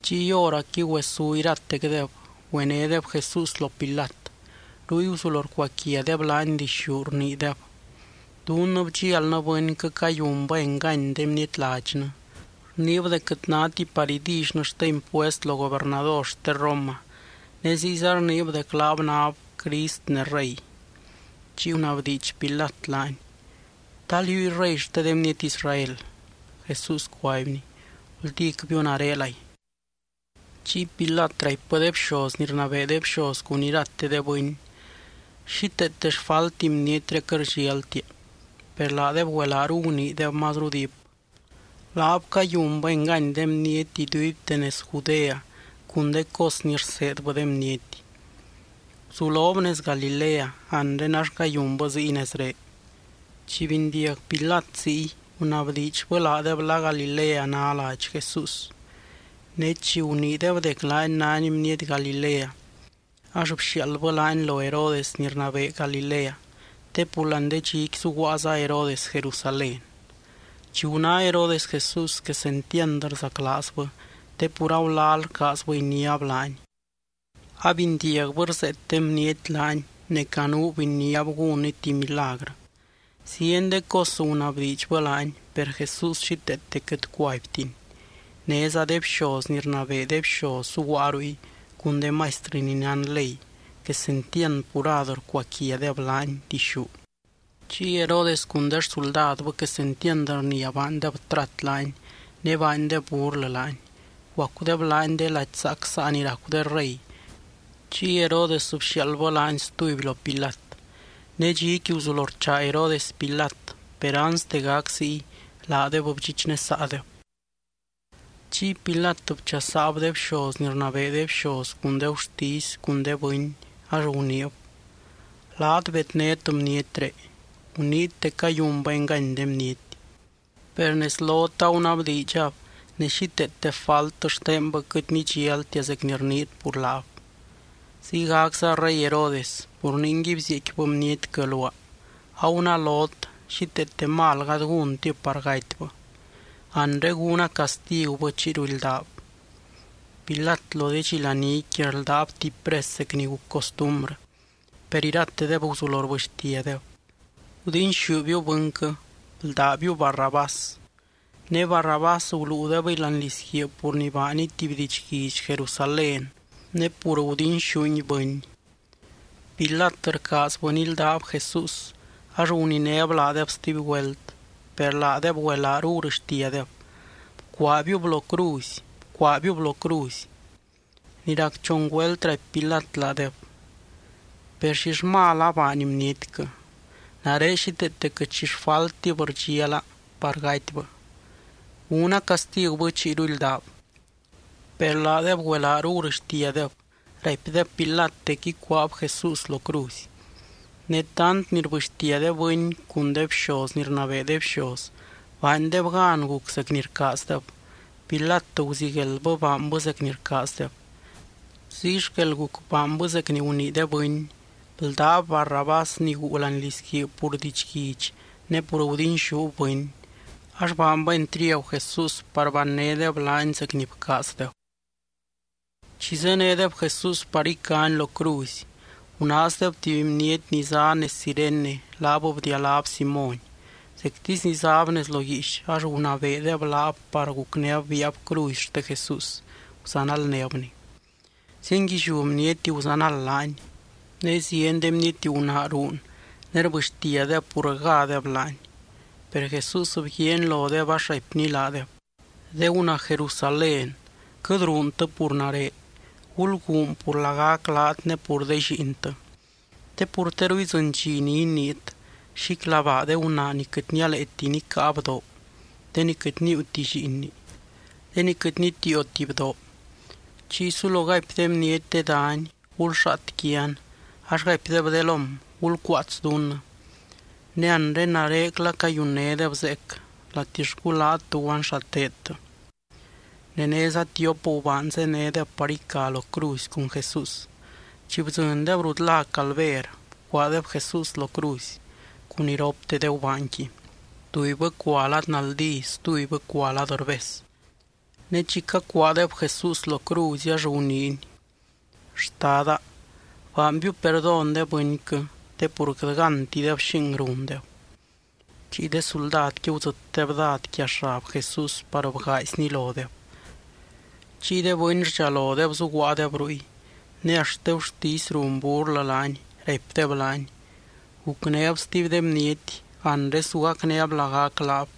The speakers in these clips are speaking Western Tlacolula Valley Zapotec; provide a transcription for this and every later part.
Chiy hóracqui güesú iratecdeb, güenédeb Jesús lo Pilat. Ruy guzulo rcuaquiadeb laany dixú, rniideb: —Dunnɨ bdxialnɨ bɨnquɨ cayunbɨ engany de bniety ladxnɨ. Rniib dec quɨt náti par idillynɨ xte impuest lo gobernador xte Roma, ne ziyza rniib dec laab náb Crist ne rey. Chiy gunabdiidx Pilat laany: —¿Ta liúy Rey xte de bniety Israel? Jesús cuaibny: —Guldícbiu narelay. Chiy Pilat raipbɨ de bxoz ni rnabee de bxoz cun irate de bɨny: —Xíteete xfalti bnietré quɨt rdxialtia. Per laadeb güelaaru guniideb mazru diip: —Laab cayunbɨ engany de bniety iduibte nez Judea cun de cos ni rseedbɨ de bniety. Guzulob nez Galilea anre ax cayunbɨ ziy nezré. Chi bindiag Pilat ziy, gunabdiidxbɨ laadeb la Galilea ná ladx Jesús. Ne chi guniideb dec laany nány bniety Galilea, ax bxiaaldbɨ laany lo Herodes ni rnabee Galilea, te pur láani de dxiqui zuguaaza Herodes Jerusalén. Chi guná Herodes Jesús quesentiand rzaclaazbɨ te pur agulal rcaazbɨ iniáb laany. Abindiagbɨ rzeet de bniety laany, ne canuub iniáb gúnny tuby milagrɨ. Zieny de cos gunabdiidxbɨ laany, per Jesús xíteete quɨt cuaibtiny. Néza de bxoz ni rnabee de bxoz zuguaa ruy, cun de maistrɨ ni nán ley, quesentiand purad rcuaquiadeb laany dixú. Chiy Herodes cun de xsuldadbɨ quesentiand rnia baandeb trat laany, ne baandeb burlɨ laany. Bguacudeb laany de lady zaac saa ni racu de rey. Chiy Herodes bxiaaldbɨ laany stuby lo Pilat. Ne dxiqui guzulo rchaa Herodes Pilat, per anste gac ziy laadeb bdxichnesaadeb. Chiy Pilat bchasaab de bxoz ni rnabee de bxoz cun de gurtisy cun de bɨny, ax guniib: —Laat bednét bnietré. Guniit dec cayunbɨ engany de bniety. Per nez lot agunabdiidxab ne xíteete falt xtenbɨ quɨt nidxialtia zec ni rniit pur laab. Ziygacza rey Herodes, pur ningui bzieecquibɨ bnietquɨ luaa. Agunalot xíteete mal gady gúntib par gatybɨ. Anre gúna castigubɨ chiyru ildaab. Pilat lo de dxi laníqui rldáb tuby pres zec ni guc costumbrɨ. Per iratedeb guzulo rbɨxtiadeb: —¡Gudinxúbiu bɨnquɨ! ¡Bldábiu Barrabás! Ne Barrabás guluudebɨy láani lizguiib pur ni baaniy tuby didxguidx Jerusalén, ne pur gudinxúngui bɨny. Pilat rcaazbɨ nildáb Jesús, ax guninéb laadeb stuby güelt, per laadeb güelaaru gurɨxtiadeb: —¡Bcuaabiub lo cruzy! ¡Bcuaabiub lo cruzy! Ni rac chon güelt raipy Pilat laadeb: —Per, ¿xill mal abaany bnietquɨ? Nare xíteete quɨt xi xfaltib rdxiala par gatybɨ. Gúna castigubɨ chiyru ildaab. Per laadeb güelaaru gurɨxtiadeb, raipdeb Pilat dec ícuaab Jesús lo cruzy. Ne tant ni rbɨxtia de bɨny cun de bxoz ni rnabee de bxoz, baandeb gan guc zec ni rcaazdeb. Pilat guzigueldbɨ baanbɨ zec ni rcaazdeb. Ziy xquel guc baanbɨ zec ni gunii de bɨny. Bldáb Barrabás ni guu láani lizguiib pur didxguidx ne pur gudinxúb bɨny, ax baanbɨ entriagu Jesús par bannédeb laany zec ni bcaazdeb. Chi zénedeb Jesús par icany lo cruzy, gunaazdeb tuby bniety ni zá nez Cirene laab bdialáb Simóny. Zectisy ni záb nez lo guiix ax gunabeedeb laab par gucnéb biaab cruzy xte Jesús, guzanaldnébny. Zienguilliú bniety guzanald laany, ne zieny de bniety gunaa ruun ne rbɨxtiadeb pur rgádeb laany. Per Jesús bguiaany lodeb ax raipny laadeb: —De gunaa Jerusalén, quɨt ruuntɨ pur nare, gulguun pur lagac laat ne pur de lliintɨ. Te pur teru idzɨny dxi ni iniit: “Xíclabaa de gunaa ni quɨt nialeeti nicáa bdoo, de ni quɨt níiuti llíinni, de ni quɨt nitiioti bdoo.” Chiy sulo gaipy de bniety de dany: “Gulxaat quian”, ax gaipdeb de lóm: “Gulcuaats dunnɨ.” Ne anre narecla cayunnédeb zeec, ¿latixcu laat tuguan xa teedtɨ? Ne néza tiop gubaan zénedeb par ica lo cruzy cun Jesús. Chi bdzɨndeb rut lá Calver, bcuaadeb Jesús lo cruzy, cun iropte de gubaanqui: tubybɨ cua lad naldí stubybɨ cua lad rbez. Ne chi cacuaadeb Jesús lo cruzy, ax guniiny: —Xtada, baanbiu perdón de bɨnquɨ, te pur quɨt gántideb xing rundeb. Chiy de suldadqui gudzɨtdeb dád quia xab Jesús par bgaaizni lodeb. Chiy de bɨny rdxalodeb zuguaadeb ruy, ne axt de gurtisy run burlɨ laany, raipdeb laany: —Gucnéb stuby de bniety. Anre su gacnéb lagac laab,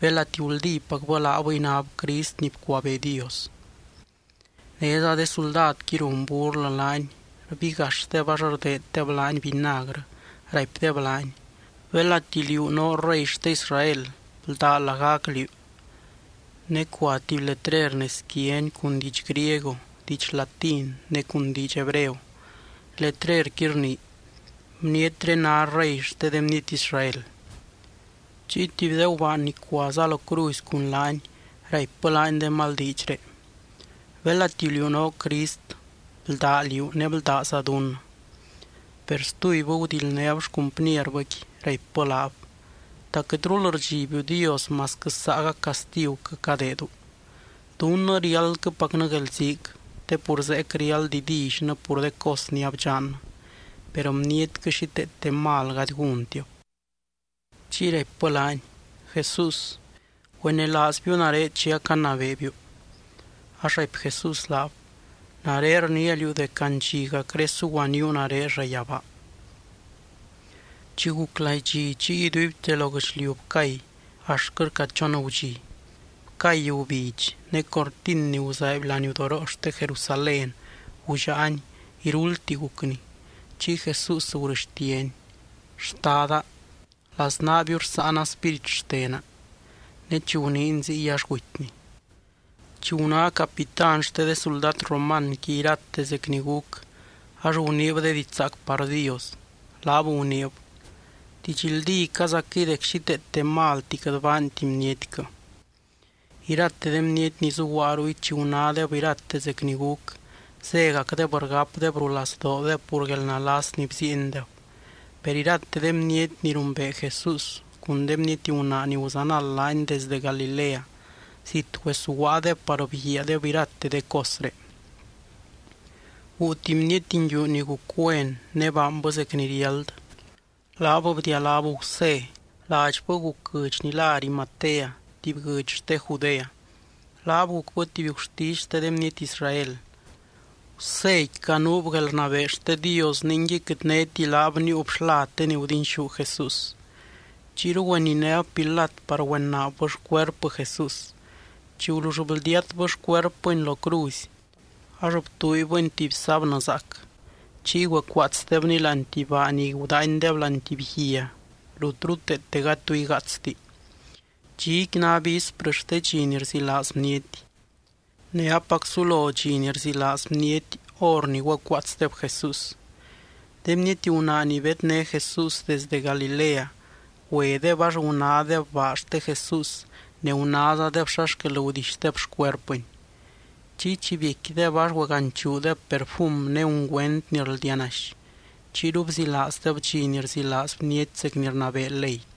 belati guldípacbɨ laabɨy náb Crist ni bcuabee Dios. Néza de suldadqui run burlɨ laany, rbigaxdeb ax rdeeddeb laany vinagrɨ raipdeb laany: —Belati liú noo Rey xte Israel, bldá lagac liú. Ne cua tuby letrer nez quiany cun diidx griego, diidx latín ne cun diidx hebreo. Letrerqui rnii: BNIETRÉ NÁ REY XTE DE BNIETY ISRAEL. Chiy tuby de gubaan ni cuaza lo cruzy cun laany raipbɨ laany de mal diidxré: —Belati liú noo Crist, bldá liú, ne bldáza dunnɨ. Per stubybɨ gudildnéb xcumpnierbɨqui, raipbɨ laab: —¿Ta quɨtrul rdxibiu Dios masquɨ saagac castiguquɨ cadeedu? Dunnɨ riáldquɨpacnɨ guelziic, te pur zeec riáld idillynɨ pur de cos ni abdxannɨ. Per bnietquɨ xíteete mal gady gúntibɨ. Chiy raipbɨ laany: —Jesús, güenelaazbiu nare chi acanabeebiu. Ax raipy Jesús laab: —Nare rniia liú dec andxiacré suguaníu nare llayabaa. Chi guc laidxi, chiy iduibte lo guɨchliu bcay, axtquɨ rca chon gudxi. Bcay gubidx, ne cortin ni guzaaiby laniudoroo xte Jerusalén gullaani, iruldti gucni. Chiy Jesús gurɨxtiany: —Xtada, laznaabiu rsáana spírit xtena. Ne chi guniiny ziy, ax gutyny. Chi guná capitán xte de suldad romanqui irate zec ni guc, ax guniib de diidx zaac par Dios. Laab guniib: —Didxldícazaquɨy dec xíteete malti quɨt baanti bnietquɨ. Irate de bniety ni zuguaa ruy chi gunádeb irate zec ni guc, zégacdeb rgapdeb rulazdoodeb pur guelnalas ni bziiendeb. Per irate de bniety ni rumbee Jesús, cun de bniety gunaa ni guzanald laany desde Galilea, zit güesuguaadeb par bguiaadeb irate de cosré. Guu tuby bniety nguiu ni guc güen ne baanbɨ zec ni riáld. Laab bdialáb Gusé. Ladxbɨ guc guɨdx ni lá Arimatea, tuby guɨdx xte Judea. Laab gucbɨ tuby gurtisy xte de bniety Israel. Guséqui canuub guelrnabee xte Dios, ningui quɨt néti laab níiub xlad de ni gudinxú Jesús. Chiyru güeninéb Pilat par güenaabbɨ xcuerpɨ Jesús. Chi gulull bldiatbɨ xcuerpɨny lo cruzy, ax btuuibɨny tuby sábnɨ zaac. Chiy güecuaatsdebny láani tuby baa ni gudaanydeb láani tuby guia, rut ruteete gady tu igaatsti. Dxiqui ná visprɨ xte dxi ni rzilaaz bniety. Ne apac sulo dxi ni rzilaaz bniety hor ni güecuaatsdeb Jesús. De bniety gunaa ni bedné Jesús desdɨ Galilea, güedeb ax gunádeb baa xte Jesús ne gunázadeb xa xquel gudixdeb xcuerpɨny. Chiy chi biecquideb ax güeganchuudeb perfum ne ungüent ni rldianaxy. Chiyru bzilaazdeb dxi ni rzilaaz bniety zec ni rnabee ley.